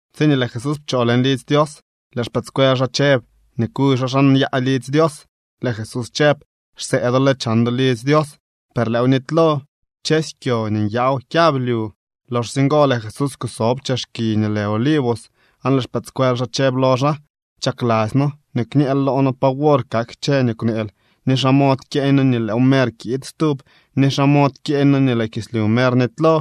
Tsiñee lëë Jesús pchoo leñ lidzy Dios, lëë xpëëdscuel xaa chëb nii kuy xaa xa nyaa lidzy Dios. Lëë Jesús chëb: —Xsee do lë chan do lidzy Dios, per lëëw nitylo. Kchësy kyo nii nyaaw kyablyu. Loxsye ngo lëë Jesús kusob chex kiy nii lë Olivos, aan lëë xpëëdscuel xaa chëb lo xaa: —Chakladzy noo nii kñëël loo noo pa wor kak kchë nii kwneel ni xa mod kyeeñ noo nii lëël mer kiid stub ni xa mod kyeeñ noo nii lëë kislyu mer nitylo.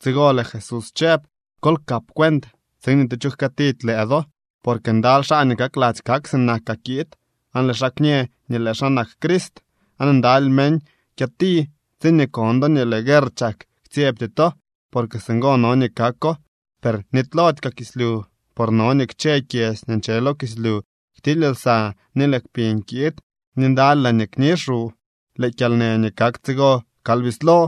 Tsigo lëë Jesús chëb: —Kol kap cuent tsiin ni tu cho jkëëtidy lëë do. Porque ndaly xaa nii kakladzy kak sinakaa kiid aan lëë xaa kñë nii lëë xaa nak Crist, aan ndaly meñ kyëti. Tsiñee kon do nii lëë guerr chak, ktsyebty to, porque singo no nii kako, per nitylody kaa kislyu. Por no nii kchë kyedzy nii nche lo kislyu ktily lsa, ni lëë kpiñ kiid, ni ndaly laañee kni xu. Lëë kyalnë nii kak tsigo kal bislo.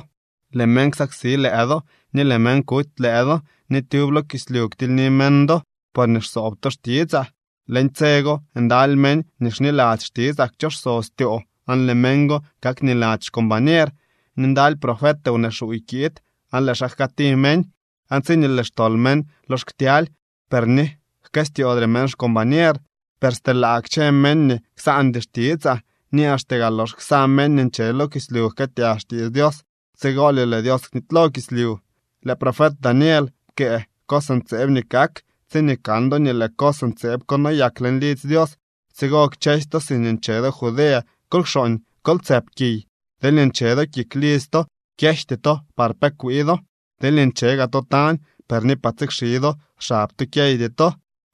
’Lëë meñ ksaksi lëë do, ni lëë meñ kuty lëë do, ni tyub lo kislyu ktilyni meñ do, porñee xsoob to xtitsaa. Leñ tse go ndaly meñ nii xniladzy xtitsaa kchoso styoo, aan lëë meñ go kakniladzy xcombañer. Ni ndaly profet wnee xuuy kiid aan lëë xaa jkëëti meñ. Aan tsiñee lëë xtol meñ lox ktyaly, per ni jkëstyoodre meñ xcombañer. Per stelaa kchë meñ nii ksaandy xtitsaa. Ni axte gaa lox ksa meñ nii nche lo kislyu jkëëtyag xtiits Dios, tsigolye lëë Dios knitylo kislyu. ’Lëë profet Daniel pkëë cos ntseeb nii kak. Tsiñee kan do nii lëë cos ntseeb ko noyak leñ lidzy Dios, tsigo kchësy to siñee nche do Judea kol kxooñ, kol tsëp kiy. Deelñee nche do kik lidzy to, kyejty to par pe kwii do. Deelñee nche gaa to tañ, per ni par tsikxi do xab to kyeydy to.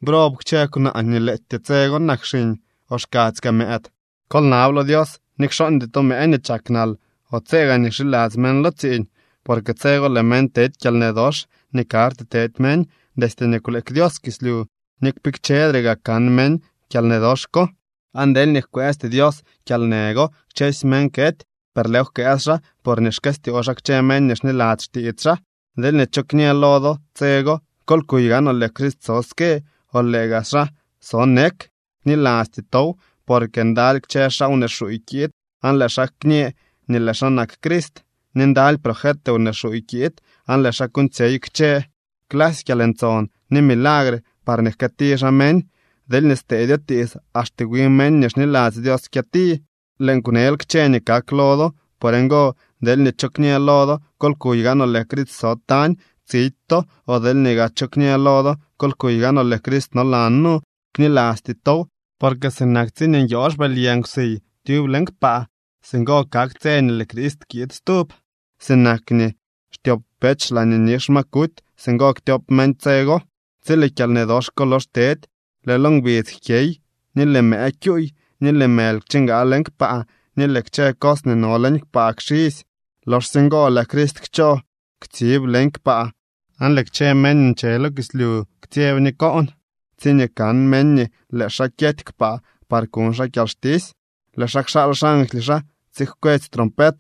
¡Brob kchë kwnaa nii lëëtyee tse go nak xiñ o xkadzy kaa mëëd! Kol nab lo Dios nii kxooñdy to mëë nii chak nal o tse nii gaa xiladzy meñ lo tsiiñ. Porque tse go lëë meñ tedy kyalnë dox nii karty te meñ destye nii kwleek Dios kislyu, ni kpikchedre gaa kan meñ kyalnë dox ko. Aan deelñee jkwëësty Dios kyalnë go, kchësy meñ kety. Per lëëw jkwëës xaa porñee xkëstyoo xaa kchë meñ nii xniladzy xtiits xaa. ’Deelñee cho kñë lo do tse go: “Kol kuy gaanoo, lëë Crist so ske”, o “lëë gaa xaa so nek”, knilasty tow. Porque ndaly kchë xaa wnee xuuy kiid aan lëë xaa kñë nii lëë xaa nak Crist, ni ndaly profet wnee xuuy kiid, aan lëë xaa kuuñtsyey kchë clasy kyalntson ni milagre parñee jkëëti xaa meñ. Deelñee steedyo tiits axte wi meñ nii xniladzy Dios kyëti. Lëën kwnel kchë nii kak lo do. Por ngo, deelñee cho kñë lo do: “Kol kuy gaanoo, lëë Crist so tañ”, tsidy to. O deelñee gaa cho kñë lo do: “Kol kuy gaanoo, lëë Crist nolan nu”, knilasty tow. Porque sinak tsiñee nyoo xbëly yë nkwsiy tyub leñ kpaa, singo kak tse nii lëë Crist kiid stub. Sinak nii xtyop pech laañee nix ma kuty, singo ktyop meñ tse go. ’Tsi lëë kyalnë dox ko lox tedy, lëë lo ngbidz jkyey, ni lëë mëë kyuuy, ni lëë mëly kchingaa leñ kpaa, ni lëë kchë cos nii no leñ kpaa kxisy. Loxsye ngo lëë Crist kchoo ktsiib leñ kpaa, aan lëë kchë meñ nii nche lo kislyu ktsyeb ni koon tsiñee kan meñ nii lëë xaa kyety kpaa par kuñ xaa kyalxtisy. Lëë xaa kxaal xangly xaa tsijkwets trompet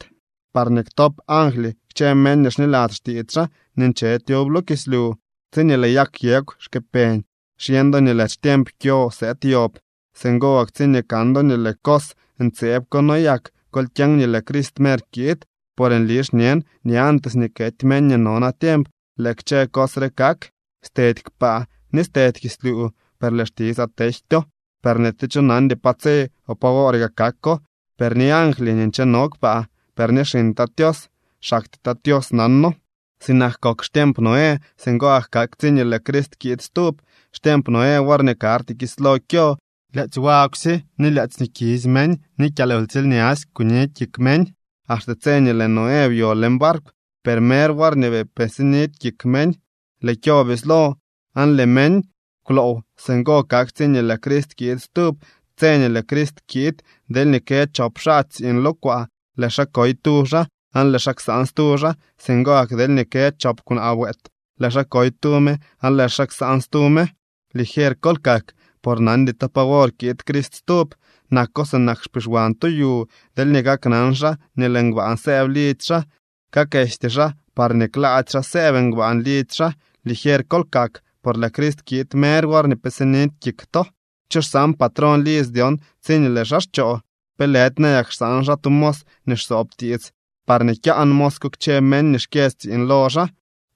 parñee ktop angly kchë meñ nii xniladzy xtiits xaa nii nche tyub lo kislyu. ’Tsiñee lëë yag yegw xkëpeñ xyeñ do nii lëë xtiemp kyo sëëd yob. Singo gak tsiñee kan do nii lëë cos ntseeb ko noyak, kol kyeñ nii lëë Crist mer kiid. Por nli xñen nii antes nii kety meñ nii no natiemp lëë kchë cos re kak. Stedy kpaa ni stedy kislyu, per lëë xtitsaa tejtyo. ’Per ni tu cho nandy pa tse o pa woor gaa kako, per ni angly nii ncheno kpaa, per ni xiñ Tat Tios. Xaktyee Tat Tios nano. ’Sinak kok xtiemp Noé, singo gak kak tsiñee lëë Crist kiid stub. Xtiemp Noé worñee karty kislo kyo, lyaadzy wagwsye, ni lyaadzy nii kisy meñ, ni kyalwtsiilñasy kuni kik meñ, axte tse nii lëë Noé byo leñ barkw. Per mer worñee bii pe sinidy kik meñ, lëë kyo bislo aan lëë meñ kwloow. Singo kak tsiñee lëë Crist kiid stub. Tse nii lëë Crist kiid, deelñee kë chop xaa tsiiñ lo kwaa, lëë xaa koy tu xaa aan lëë xaa ksaan stu xaa. Singo gak deelñee kë chop kwnaa wëët, lëë xaa koy tu me aan lëë xaa ksaan stu me. ’Ligier kol kak, por nandy to pa wor kiid Crist stub. Nako sinak xpixwan tu yu, deelñee kaknan xaa nii lëë ngbaan sëëb lidzy xaa, kaakesty xaa parñee klaady xaa sëëb ngbaan lidzy xaa. Ligier kol kak, por lëë Crist kiid mer worñee pe sinidy kik to. ’¿Cho xsaan patrón lidzy dyon tsiñee lëë xaa xchoo? ¿Pe lëdy nayak xsaan xaa tu mos nii xsoob tiits, parñee kyaan mos ko kchë meñ nii xkyë tsiiñ lo xaa?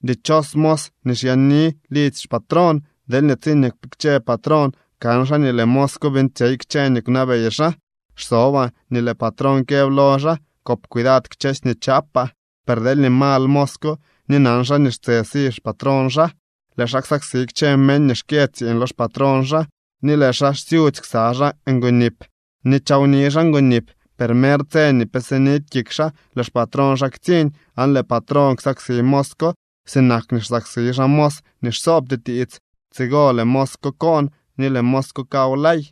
Dichos mos nii xyaani lidzy xpatrón deelñee tsiñee kpikche patrón kan xaa nii lëë mos ko beeñtsyey kchë nii kwnabey xaa. Xsobaa nii lëë patrón këb lo xaa: “Kop cuidad kchësy nii chaapaa.” Per deelñee mal mos ko ni nan xaa nii xtse si xpatrón xaa, lëë xaa xsaksi kchë meñ nii xkyë tsiiñ lo xpatrón xaa ni lëë xaa xsyudzy ksa xaa ngonip, ni chawni xaa ngonip. Per mer tse nii pe sidy kik xaa, lëë xpatrón xaa ktsiñ. Aan lëë patrón ksaksi mos ko sinak nii xsaksi xaa mos nii xsoobty tiits. Tsigo lëë mos ko koon ni lëë mos ko kawlay.